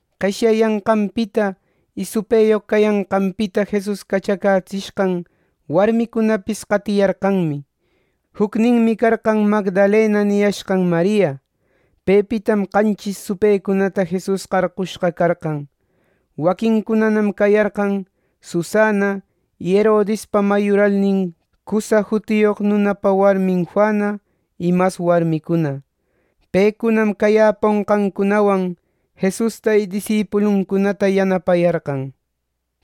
Qeshyayanqanpita y supëyoq cayanqanpita Jesus cachacätsishqan warmicunapis qatiyarqanmi. Jucninmi carqan Magdalena niyashqan Maria. Pepitam qanchis supëcunata Jesus qarqushqa carqan. Waquincunanam cayarqan: Susana y Herodispa mayuralnin Cusa jutiyoq nunapa warmin Juana y mas warmicuna. Pecunam cayäponqancunawan Jesusta y disipuluncunata yanapayarqan.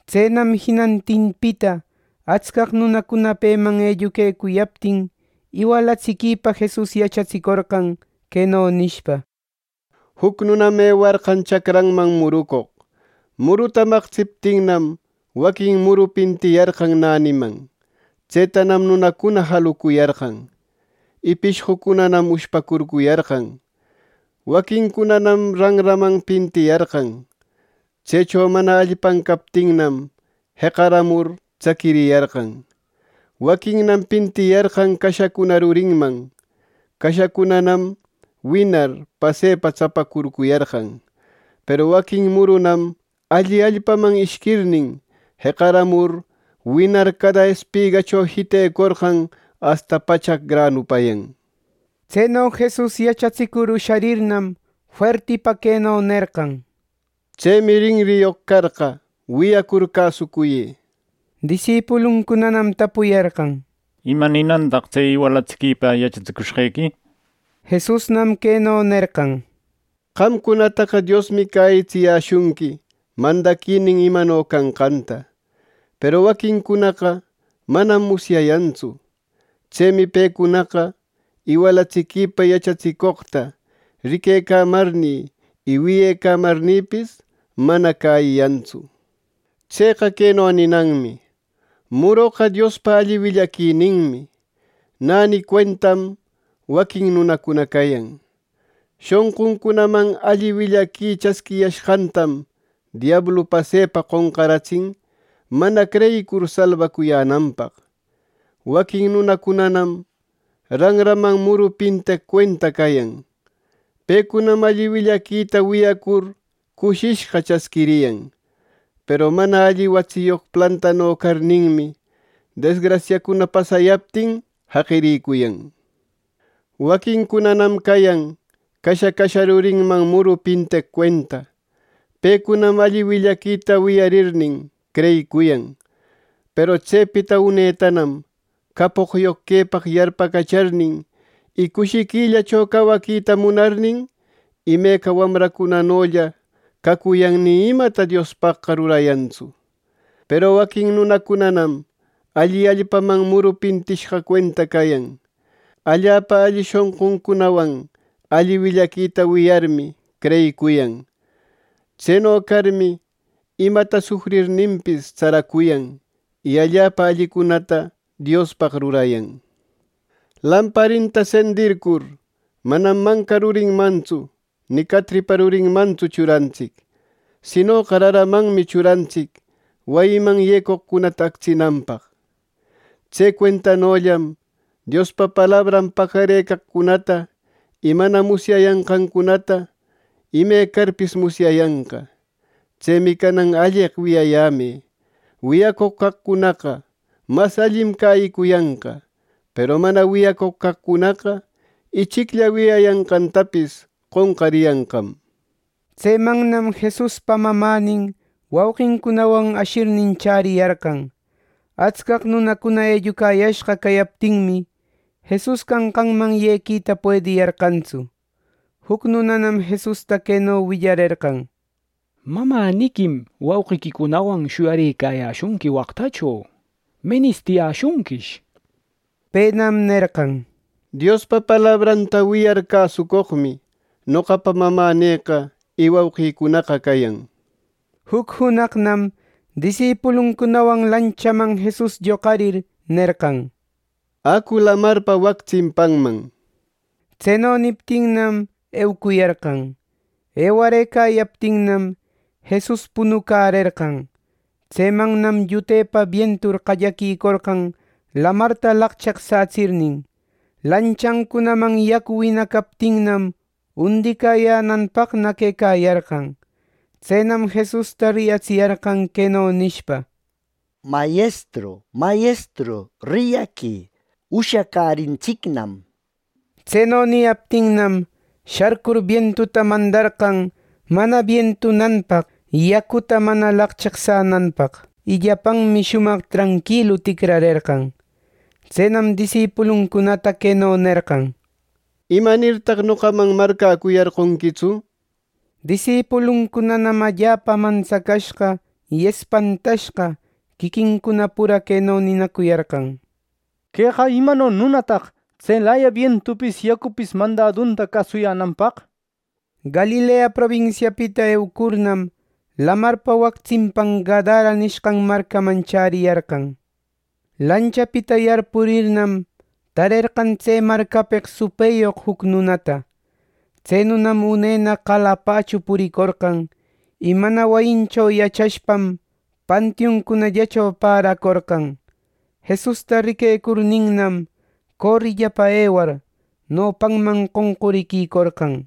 Tsenam jinantinpita atscaq nunacuna peman elluquecuyaptin, iwalatsiquipa Jesus yachatsicorqan, queno nishpa: —Juc nunam ewarqan chacranman murucoq. Muruta maqtsiptinnam, waquin muru pintiyarqan näniman. Tsetanam nunacuna jalucuyarqan, y pishqucunanam ushpacurcuyarqan. Waquincunanam ranraman pintiyarqan. Tsecho mana allpan captinnam, jeqaramur tsaquiriyarqan. Waquinnam pintiyarqan cashacuna rurinman. Cashacunanam winar, pasepa tsapacurcuyarqan. Peru waquin murunam alli allpaman ishquirnin, jeqaramur, winar cada espigacho jitecorqan asta pachaq granupayan. Tseno Jesus yachatsicur usharirnam, fuertipa queno nerqan: —¡Tsemi rinriyoq carqa, wiyacur cäsucuyë! Disipuluncunanam tapuyarqan: —¿Ima ninantaq tse iwalatsiquipa yachatsicushqequi? Jesusnam queno nerqan: —Qamcunataqa Diosmi cäyitsiyäshunqui mandaquinin imano canqanta; peru waquincunaqa manam musyayantsu. Tsemi pecunaqa iwalatsiquïpa yachatsicoqta riquecamarnï y wiyecamarnïpis, mana cäyiyantsu. “Tseqa queno ninanmi: muroqa Diospa alli willaquininmi. Näni cuentam waquin nunacuna cayan. Shonquncunaman alli willaqui chasquiyashqantam diablu pasepa qonqaratsin mana creyicur salbacuyänanpaq. Waquin nunacunanam ranraman muru pinteq cuenta cayan. Pecunam alli willaquita wiyacur cushishqa chasquiriyan. Peru mana alli watsiyoq plantano carninmi, desgrasiacuna pasayaptin, jaqiricuyan. Waquincunanam cayan casha, casha rurinman muru pinteq cuenta. Pecunam alli willaquita wiyarirnin creyicuyan. Peru tsepita unetanam capoqyoq quepaq yarpacacharnin, y cushiquillacho cawaquita munarnin, imeca wamracunanolla cacuyan ni imata Diospaqqa rurayantsu. Peru waquin nunacunanam alli allpaman muru pintishqa cuenta cayan. Allapa alli shonquncunawan alli willaquita wiyarmi, creyicuyan. Tseno carmi, imata sufrirninpis tsaracuyan, y allapa allicunata Diospaq rurayan. “Lamparinta sendircur, manam manca rurinmantsu ni catripa rurinmantsu churantsic; sinoqa raramanmi churantsic, wayiman yecoqcunata actsinanpaq. Tse cuentanollam Diospa palabran pacarëcaqcunata y mana musyayanqancunata imecarpis musyayanqa. “Tsemi canan alleq wiyayämë: Wiyacoq caqcunaqa mas allim cäyicuyanqa, peru mana wiyacoq caqcunaqa, ichiclla wiyayanqantapis qonqariyanqam.” Tsemannam Jesuspa mamänin wauqincunawan ashirnin chäriyarqan. Atscaq nunacuna ellucayashqa cayaptinmi, Jesus canqanman yequita puediyarqantsu. Juc nunanam Jesusta queno willarerqan: —Mamäniquim wauqiquicunawan shuyarëcayäshunqui waqtacho. Menistiyäshunquish —nir. Penam nerqan: —Dios palabranta wiyar cäsucoqmi, noqapa mamänïqa y wauqïcunaqa cayan. Juc junaqnam disipuluncunawan lanchaman Jesus lloqarir, nerqan: —Acu lamarpa wac tsimpanman. Tseno niptinnam, eucuyarqan. Ewarëcayaptinnam, Jesus punucärerqan. Tsemannam llutepa bientur qallaquicorqan lamarta laqcheqsätsirnin. Lanchancunaman yacu winacaptinnam undicäyänanpaqna quecayarqan. Tsenam Jesusta riyatsiyarqan, queno nishpa: —¡Mayestru, Mayestru, riyaquï! ¡Ushacärintsicnam! —nir. Tseno niyaptinnam, sharcur bientuta mandarqan mana bientunanpaq yacuta mana laqcheqsänanpaq. Y llapanmi shumaq tranquilu ticrarerqan. Tsenam disipuluncunata queno nerqan: —¿Imanirtaq noqaman marcäcuyarqonquitsu? Disipuluncunanam allapa mantsacashqa y espantashqa, quiquincuna pura queno ninacuyarqan: —¡Queqa imano nunataq, tselaya bientupis yacupis mandadunta cäsuyänanpaq! Galilea probinsiapita eucurnam, lamarpa wac tsimpan Gadara nishqan marcaman chäriyarqan. Lanchapita yarpurirnam, tarerqan tse marcapeq supëyoq juc nunata. Tse nunam unena qalapachu puricorqan. Y mana wayincho yachashpam, pantiuncunallacho paracorqan. Jesusta riquecurninnam, corillapa ewar, nopanman qoncuriquicorqan.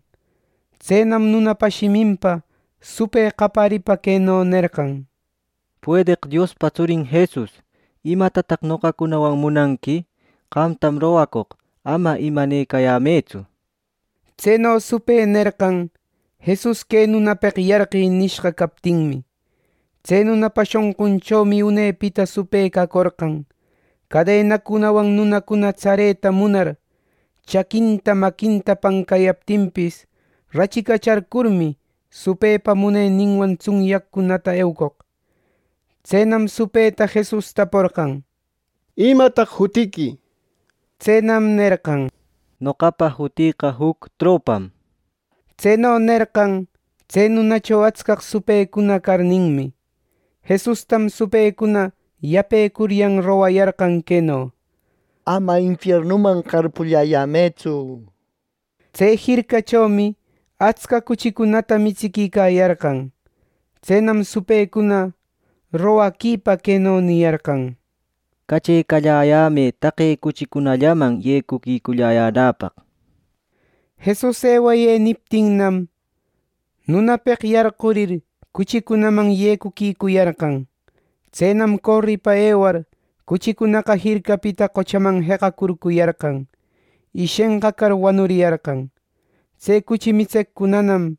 Tsenam nunapa shiminpa supë qaparipa queno nerqan: —Puedeq Diospa tsurin Jesus, ¿imatataq noqacunawan munanqui! ¡Qamtam rogacoq ama imanecayämëtsu! Tseno supë nerqan, Jesus “¡Que nunapeq yarqï!” nishqa captinmi. Tse nunapa shonqunchomi unepita supë cacorqan. Cadenacunawan nunacuna tsareta munar, chaquinta, maquinta pancayaptinpis, rachicacharcurmi, supëpa muneninwan tsunyaqcunata eucoq. Tsenam supëta Jesus taporqan: —¿Imataq jutiqui? —nir. Tsenam nerqan: —Noqapa jutïqa juc tropam. Tseno nerqan, tse nunacho atscaq supëcuna carninmi. Jesustam supëcuna yapecuryan rogayarqan queno: —Ama infiernuman qarpulläyämëtsu —nishpa. Tse jircachomi atsca cuchicunata mitsiquicayarqan. Tsenam supëcuna mañepa, queno niyarqan: —Cachecalläyämë taqe cuchicunallaman yecuquiculläyänäpaq —nir. Jesus “ewayë” niptinnam, nunapeq yarqurir, cuchicunaman yecuquicuyarqan. Tsenam, coripa ewar cuchicunaqa jircapita qochaman jeqacurcuyarqan, y shenqacar, wanuriyarqan. Tse cuchi mitseqcunanam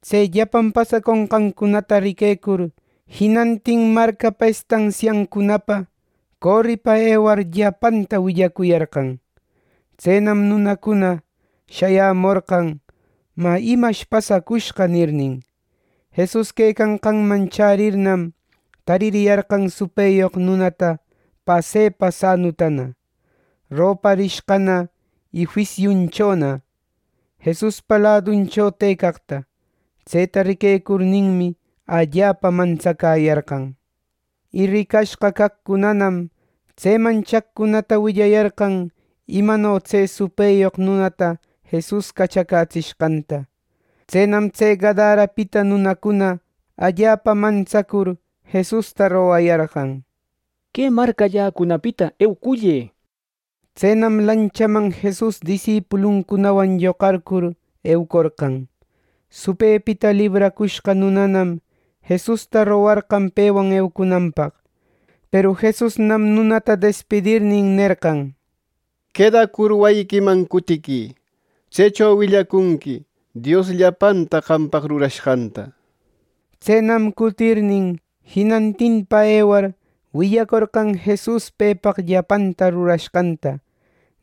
tse llapan pasaconqancunata riquecur, jinantin marcapa estansiancunapa coripa ewacur, llapanta willacuyarqan. Tsenam nunacuna shayämorqan, “Mä, ¿imash pasacushqa?” nirnin. Jesus quecanqanman chärirnam, taririyarqan supëyoq nunata pasepa sanutana, roparishqana y juisiunchona, Jesuspa laduncho tëcaqta. Tseta riquecurninmi, allapa mantsacäyarqan. Y ricashqa caqcunanam tseman chaqcunata willayarqan imano tse supëyoq nunata Jesus cachacätsishqanta. Tsenam tse Gadarapita nunacuna allapa mantsacur, Jesusta rogayarqan: —Que marcalläcunapita eucullë —nishpa. Tsenam lanchaman Jesus disipuluncunawan lloqarcur, eucorqan. Supëpita libracushqa nunanam Jesusta rogarqan pewan eucunanpaq. Peru Jesusnam nunata despidirnin, nerqan: —Quedacur, wayiquiman cutiquï. Tsecho willacunqui Dios llapanta qampaq rurashqanta. Tsenam cutirnin, jinantinpa ewar, willacorqan Jesus pepaq llapanta rurashqanta.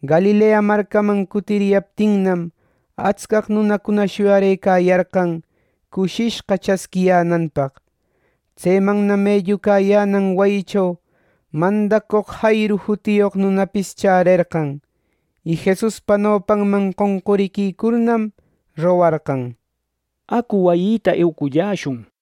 Galilea marcaman cutiriyaptinnam, atscaq nunacuna shuyarëcayarqan, cushishqa chasquiyänanpaq. Tsemannam ellucayänan wayicho mandacoq Jairu jutiyoq nunapis chärerqan, y Jesuspa nopanman qonquriquicurnam, rogarqan: —Acu, wayïta eweculläshun —nishpa.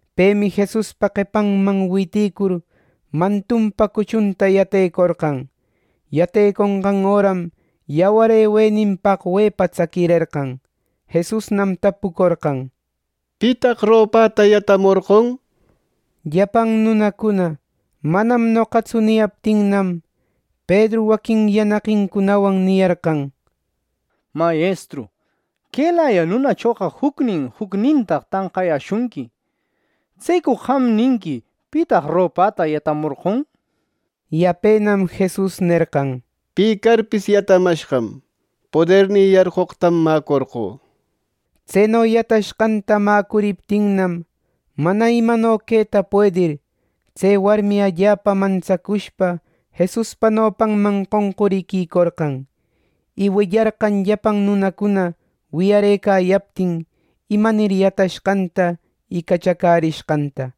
Pemi Jesuspa qepanman witïcur, mantunpa cuchunta yatecaporqan. Yateconqan öram yawar ewenin paqwepa tsaquirerqan. Jesusnam tapucorqan: —¿Pitaq ropäta yatamorqon? —nishpa. Llapan nunacuna “Manam noqatsu” niyaptinnam, Pedru waquin yanaqincunawan niyarqan: —¡Mayestru, quelaya nunachoqa jucnin jucnintaq tanqayäshunqui! ˻¿Tsecu qam ninqui, ‘Pitaq ropäta yatamorqon?˼’ Yapenam Jesus nerqan: —¡Pi carpis yatamashqam! Podernï yarqoqtam mäcorqö. Tseno yatashqanta mäcuriptinnam, mana imano queta puedir, tse warmi allapa mantsacushpa Jesuspa nopanman qonquriquïcorqan. Y willarqan llapan nunacuna wiyarëcayaptin, imanir yatashqanta y cachacärishqanta.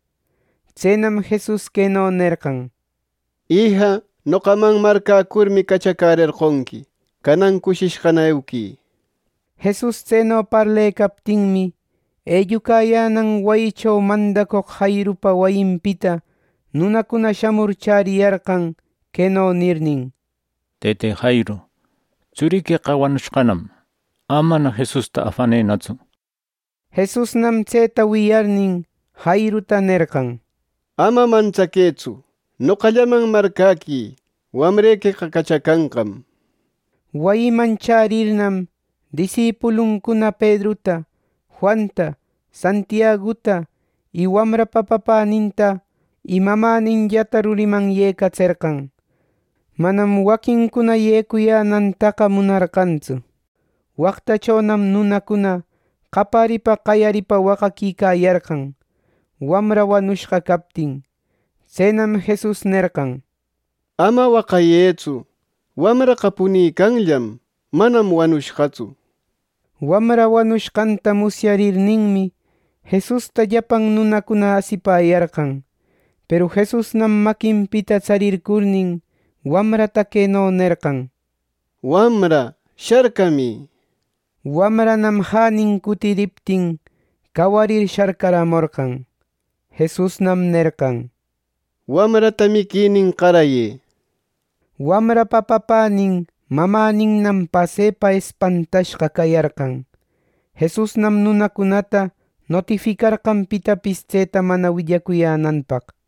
Tsenam Jesus queno nerqan: —Ija, noqaman marcäcurmi cachacärerqonqui. Canan cushishqana euquï. Jesus tseno parlecaptinmi, ellucayänan wayicho mandacoq Jairupa wayinpita nunacuna shamur chäriyarqan queno nirnin: —Tëte Jairu, ¡tsuriqueqa wanurishqanam! ¡Amana Jesusta afanënatsu! Jesusnam tseta wiyarirnin, Jairuta nerqan: —Ama mantsaquëtsu. Noqallaman marcäquï; wamrequeqa cachacanqam. Wayiman chärirnam, disipuluncuna Pedruta, Juanta, Santiaguta y wamrapa papäninta y mamäninllata ruriman yecatserqan. Manam waquincuna yecuyänantaqa munarqantsu. Waqtachonam nunacuna qaparipa qayaripa waqaquicayarqan, wamra wanushqa captin. Tsenam Jesus nerqan: —Ama waqayëtsu. Wamraqa punicanllam. Manam wanushqatsu. Wamra wanushqanta musyarninmi, Jesusta llapan nunacuna asipäyarqan. Peru Jesusnam maquinpita tsarircurnin, wamrata queno nerqan: —Wamra, sharcamï. Wamranam jänin cutiriptin, cawarir sharcaramorqan. Jesusnam nerqan: —Wamrata miquinin qarayë —nishpa. Wamrapa papänin mamäninnam pasepa espantashqa cayarqan. Jesusnam nunacunata notificarqan pitapis tseta mana willacuyänanpaq.